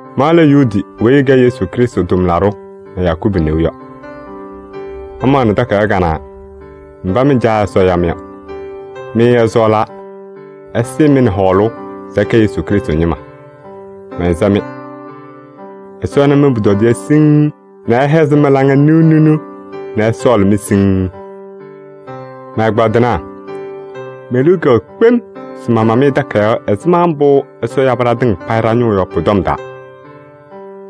Ma lɛ Yuudi weyi ɛkɛ Yesu Krɩstʋ tʋmlaɖʋ nɛ Yakubu neu yɔ. Mamaɣnɩ takayaɣ kanɛ mba mɩ Caa Ɛsɔ ya-mɩ yɔ. Mɩ ɛsɔɔlaa nɛ ɛsɩɩ-mɩ nɛ hɔɔlʋʋ se ɩkɛ Yesu Krɩstʋ ñɩma. Mɛnsɛ-mɩ: Ɛsɔ ɛna mɩ-pʋtɔdɩyɛ siŋŋ nɛ ɛhɛzɩ mɩ-laŋa niɣniɣ nɛ ɛsɔɔlɩ-mɩ siŋŋ. Mɛ-ɛgbaadɩnaa! Me-liu kɛwɛɛ kpem se mama-mɩ takayaɣ ɛzɩma mbʋ Ɛsɔ yabɩ ɖatɩŋa payɩ ɖa-ñʋʋ yɔ pʋ-tɔm taa.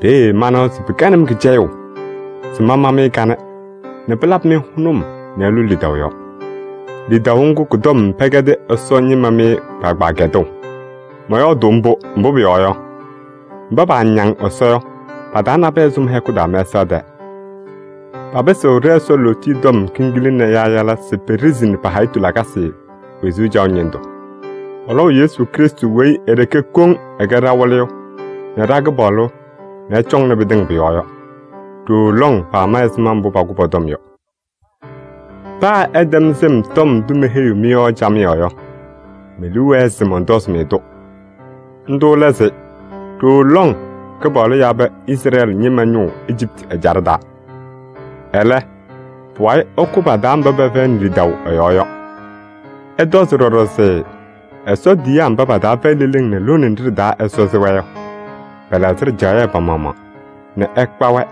Peeye manawa se pɩkɛnɩ-m kɩcɛyʋʋ se mama-mɩ kanɛ nɛ pɩlabɩ-mɩ hʋnʋm nɛ ɩlʋ lidaʋ yɔɔ. Lidaʋ ŋgʋ kʋ-tɔm pɛkɛdɩ Ɛsɔ ñɩma mɩ kpaagbaa kɛdʋʋ. Mɔyɔɔdʋʋ mbʋ, mbʋ pʋyɔɔ yɔ, mba paañaŋ Ɛsɔ yɔ pa-taa nabɛyɛ sʋ mɩ-hɛkʋ taa mɛsaɣ tɛɛ. Papɩsɩɣ ɖɛ-Ɛsɔ lootiye tɔm kiŋgila nɛ yaayala se peɖesini pa-hayitu lakasɩ wezuu caɣʋ ñɩndʋ. Pɔlɔʋ Yesu Krɩstʋ weyi e-ɖeke koŋ ɛkɛ ɖa-Wɩlɩyʋ nɛ ɖa-Kɩpaɣlʋ nɛ ɛcɔŋnɩ pɩtɩŋa pʋ-yɔɔ yɔ. Ɖooo lɔŋ pama ɛzɩma mbʋ pakʋʋ pɔ-tɔm yɔ. Paa ɩtɛm sɩm tɔm ndʋ meheyiɣ-mɩ yɔ camɩyɛ yɔ, me-liu wɛɛ se mɔntɔzɩ-mɩ-tʋ. Ndʋ lɛ se ɖooo lɔŋ Kɩpaɣlʋ yabɩ Izrɛɛlɩ ñɩma ñʋʋ Ejiptɩ ɛjaɖɛ taa. Ɛlɛ, pʋwayɩ ɛkʋ pa-taa mba pɛfɛyɩnɩ lidaʋ ɛ-yɔɔ yɔ. Ɩtɔzɩ ɖɔɖɔ se Ɛsɔ tiyiyaa mba pa-taa fɛyɩ leleŋ nɛ lone nɖɩ ɖɩ-taa Ɛsɔ sɩ-wɛ yɔ, pɛlɛɣzɩ ɖɩjaɣyɛ pa-maɣmaɣ nɛ ɛkpa-wɛ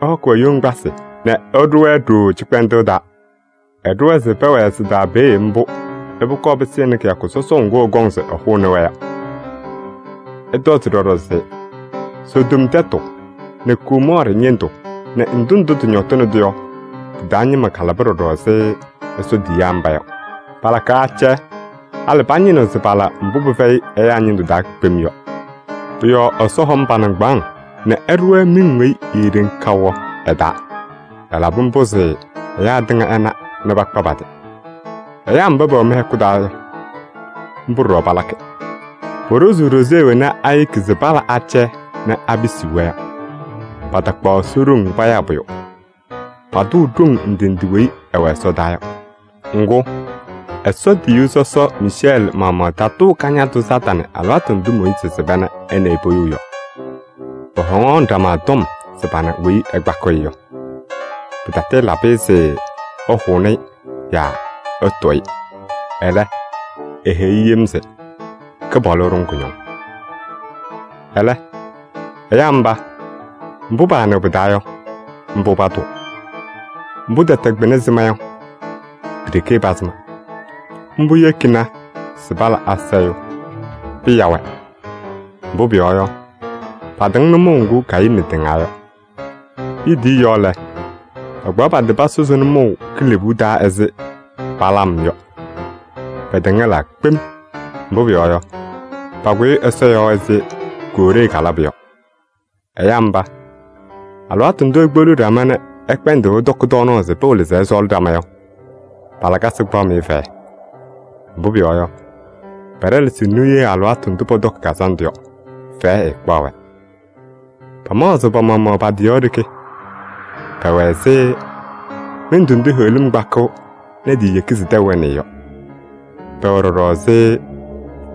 ɛhɔkɩ-wɛ yoŋgbasɩ nɛ ɛɖʋ-wɛ ɖooo cɩkpɛndʋʋ taa. Ɛɖʋ-wɛ se pɛwɛɛ sɩ-taa peeye mbʋ nɛ pʋkɔɔ pɩsɩnɩ kɩyakʋ sɔsɔʋ ŋgʋ ɛkɔŋ ɛhʋnɩ-wɛ yɔ. Ɩtɔzɩ ɖɔɖɔ se Sodom tɛtʋ nɛ Gomɔɔrɩ ñɩndʋ nɛ ndʋ ndʋ tɩñɔtɩnɩ-tʋ yɔ, tɩ-taa ñɩma kalaba ɖɔɖɔ ɛzɩ Ɛsɔ tiyiyaa mba yɔ. Palakaɣ acɛyɛ, halɩ pañɩnɩɣ se pala mbʋ pɩfɛyɩ ɛyaa ñɩndʋ taa kpem yɔ. Pʋ-yɔɔ Ɛsɔ hɔm pa-nɩŋgbaaŋ nɛ ɛɖʋ-wɛ miŋ weyi eeɖeŋ kaʋ yɔ ɛ-taa. Ɛlabɩ mbʋ se ɛyaa tɩŋa ɛna nɛ pakpa pa-tɩ. Ɛyaa mba pɛwɛ mɩ-hɛkʋ taa yɔ, mbʋ ɖɔɖɔ palakɩ. Poɖozuu ɖoze wena ayeki se pala acɛyɛ nɛ apisiɣ-wɛ yɔ. Patakpaɣ Ɛsɔ ɖoŋ payaa pʋyʋ. Patʋʋ ɖoŋ ndɩ ndɩ weyi ɩwɛ ɛsɔdaa yɔ. Ŋgʋ, Ɛsɔ tiyiyu sɔsɔ Miicɛɛlɩ maɣmaɣ taatʋʋ Kañadʋ Satanɩ alɩwaatʋ ndʋ Mooyiizi sɩba nɛ ɛ nɛ ɩ poyou yɔ. Pɔhɔŋaɣnɩ ɖama tɔm se pana weyi ɛkpakɩɣ-ɩ yɔ. Pɩtatɩɩlabɩ-ɩ se ɛhʋnɩ-ɩ nɛ ɛtʋʋ-ɩ. Ɛlɛ, eheyi-i yem se: “Kɩpaɣlʋ ɛɖʋ-ŋ kʋñɔŋ!” Ɛlɛ, ɛyaa mba, mbʋ paanɩɣ pɩ-taa yɔ, mbʋ patʋʋ. Mbʋ tɛtɛ kpɩna sɩma yɔ, pi-ɖeke pasɩma. Mbʋ yekini se pala asayʋʋ. Pɩya-wɛ! Mbʋ pʋyɔɔ yɔ, patɩŋ nʋmɔʋ ŋgʋ Kayɩnɩ tɩŋaa yɔ. Liidiye yɔɔ lɛ, pakpaɣ pa-tɩ pasʋzɩ nʋmɔʋ kilebuu taa ɛzɩ Balaam yɔ. Pɛtɛŋɛlaa kpem, mbʋ pʋyɔɔ yɔ, pakʋyɩ Ɛsɔ yɔɔ ɛzɩ Kooree kalabʋ yɔ. Ɛyaa mba, alɩwaatʋ ndʋ ikpeɣliɣ ɖama nɛ ɩkpɛndɩɣ ɩtɔkɩ tɔɔnaɣ se pɩwɩlɩ se ɩsɔɔlɩ ɖama yɔ, pa-lakasɩ kpaɣ-mɩ fɛyɛ. Mbʋ pʋyɔɔ yɔ, pɛɖɛlɛsɩɣ niye alɩwaatʋ ndʋ pɔtɔkɩ kazandʋ yɔ, fɛyɛ ɛɛkpaɣ-wɛ. Pamaɣzɩɣ pa-maɣmaɣ pa-tɩ yɔɔ ɖeke. Pɛwɛ ɛzɩ mɩndʋ ndʋ heɣlim kpakɩɣ nɛ tiiyeki se tɛʋ ɛnɩɩ yɔ. Pɛwɛ ɖɔɖɔ ɛzɩ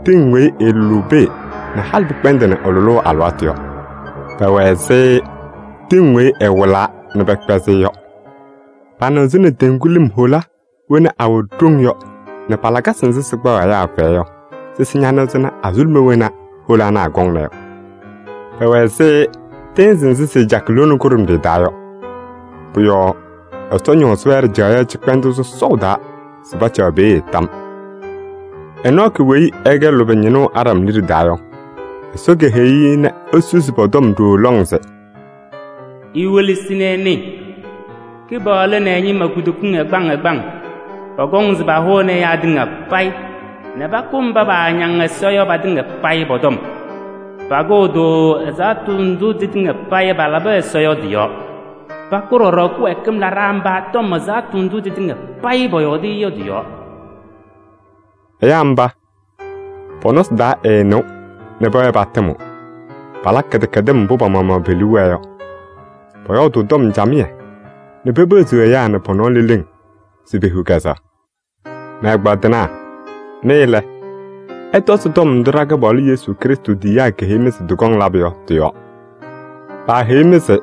tɩŋ weyi ɩɩlʋlʋʋ pee nɛ halɩ pɩkpɛndɩnɩ ɩ-lʋlʋʋ alɩwaatʋ yɔ. Pɛwɛ ɛzɩ tɩŋ weyi ɩwɩlaa nɛ pɛkpɛzɩ-ɩ yɔ. Panɩɣzɩnɩ teŋgu lɩm hola wena awɛ ɖoŋ yɔ nɛ pa-lakasɩ nzɩ sɩkpaɣ ɛyaa fɛyɛ yɔ sɩsɩ ñanɩɣzɩnɩ azuluma wena hola ana akɔŋna yɔ. Pɛwɛ ɛzɩ tɩɩnzɩ nzɩ sɩɩcakɩ lone kʋɖʋmɖɩyɛ taa yɔ. Pʋ-yɔɔ Ɛsɔ ñɔɔzɩ-wɛ ɖɩjaɣyɛ cɩkpɛndʋʋ sɔsɔʋ taa se pacaɣ peeye tam. Enɔɔkɩ weyi ɛkɛ lʋbɛ ñɩnʋ Aɖam liɖe taa yɔ, Ɛsɔ keheyi-i nɛ esusi pɔ-tɔm ɖooo lɔŋ se: “Iwelesi nɛ ɩnɩɩ, Kɩpaɣlʋ nɛ ɛ-ñɩma kutokiŋ ɛgbaŋ ɛgbaŋ pɔkɔŋ se pahʋnɩ ɛyaa tɩŋa payɩ nɛ pakʋ mba paañaŋ Ɛsɔ yɔ patɩŋa payɩ pɔ-tɔm. Pakʋʋ-tʋ ɛzaɣtʋ ndʋ tɩtɩŋa payɩ palabɩ Ɛsɔ yɔ tɩ-yɔɔ. Pakʋʋ ɖɔɖɔ kɩwɛɛkɩm laɖaa mba tɔm ɛzaɣtʋ ndʋ tɩtɩŋa payɩ pɔyɔɔdɩ-ɩ yɔ tɩ-yɔɔ.” Ɛyaa mba, pɔ-nɔsɩ taa ɛɛnɩɣ nɛ pɛwɛɛ patɩmɩɣ. Palakɩ kɩdɛkɛdɩm mbʋ pa-maɣmaɣ pe-liu wɛɛ yɔ. Pɔyɔɔdʋʋ tɔm camɩyɛ nɛ pepeɣziɣ ɛyaa nɛ pɔ-nɔɔ leleŋ se pehiɣ kɛzɛɣ. Mɛ-ɛgbaadɩnaa! Mɩ lɛ, ɩtɔzɩ tɔm ndʋ ɖa-Kɩpaɣlʋ Yesu Krɩstʋ tiyiyaa keheyi-mɩ se tɩkɔŋ labʋ yɔ tɩ-yɔɔ. Paaheyi-mɩ se: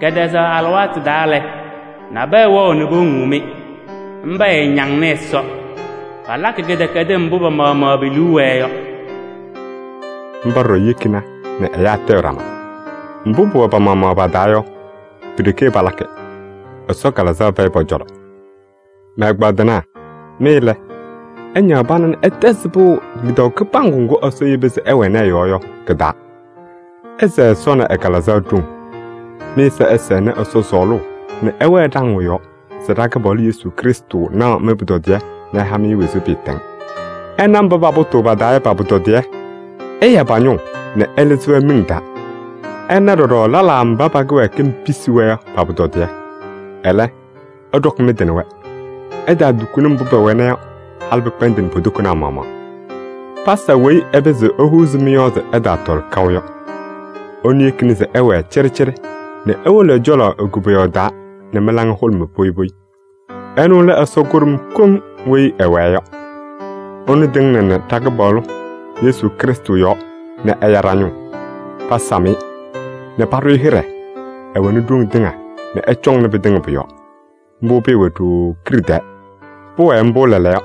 “Kɛtɛzaɣ alɩwaatʋ taa lɛ, nabɛyɛ wɛɣ nɛ powoŋuu-mɩ. Mba ɛɛñaŋnɩ Ɛsɔ, palakɩ kɩdɛkɛdɩm mbʋ pa-maɣmaɣ pe-liu wɛɛ yɔ.” Mba ɖɔɖɔ yekina nɛ ɛyaa tayɩɣ ɖama. Mbʋ pʋwɛ pa-maɣmaɣ pa-taa yɔ, pi-ɖeke palakɩ. Ɛsɔ Kalɩzaɣ fɛyɩ pɔ-cɔlɔ. Mɛ-ɛgbaadɩnaa! Mɩ lɛ, ɩñaɣ pana nɛ ɩtɛzɩ pɩʋ lidaʋ kɩbaŋgʋ ŋgʋ Ɛsɔ yeba se ɩwɛnɩ ɛ-yɔɔ yɔ kɩ-taa. Ɩsɛɛ Ɛsɔ nɛ ɛ-Kalɩzaɣ ɖoŋ. Mɩ-ɛza ɛsɛnɩ Ɛsɔ sɔɔlʋʋ nɛ ɩwɛɛ ɖaŋʋʋ yɔɔ se ɖa-Kɩpaɣlʋ Yesu Krɩstʋ naɣ mɩ-pʋtɔdɩyɛ nɛ ɛha-mɩ wezuu pɩɩtɛŋ. Ɩna mba papʋtʋʋ pa-taa yɔ pa-pʋtɔdɩyɛ: ɩya pa-ñʋʋ nɛ ɩlɩzɩ-wɛ miŋ taa. Ɩna ɖɔɖɔ lɛlaa mba pa-kɩwɛɛkɩm pisi-wɛ yɔ pa-pʋtɔdɩyɛ. Ɛlɛ, ɩɖɔkɩ mɩ-tɩ nɛ wɛ. Ɩtaatukuni mbʋ pɛwɛna yɔ, halɩ pɩkpɛndɩnɩ po-tokonaa maɣmaɣ. Pasa weyi ɛpɩzɩɣ ehuuzi mɩ-yɔɔ se ɩtaatɔlɩ kaʋ yɔ. Ɛnʋ yekini se ɩwɛɛ cɩɖɩcɩɖɩ nɛ iwolo ɛ-cɔlɔ e-koboyaɣ taa nɛ mɩ-laŋa hʋlʋmɩ poyi poyi. Ɛnʋ lɛ Ɛsɔ kʋɖʋm koŋ weyi ɛwɛɛ yɔ. Ɛnʋ tɩŋnɩnɩ ɖa-Kɩpaɣlʋ Yesu Krɩstʋ yɔɔ nɛ ɛya ɖa-ñʋʋ. Pasam-ɩ nɛ paɖʋ-ɩ hɩɖɛ. Ɛwɛnɩ ɖoŋ tɩŋa nɛ ɛcɔŋnɩ pɩtɩŋa pʋ-yɔɔ. Mbʋ pɩɩwɛ ɖooo kiɖe tɛɛ. Pʋwɛɛ mbʋ lɛɛlɛɛyɔ,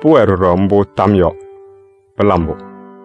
pʋwɛɛ ɖɔɖɔ mbʋ tam yɔɔ! Pɩla mbʋ!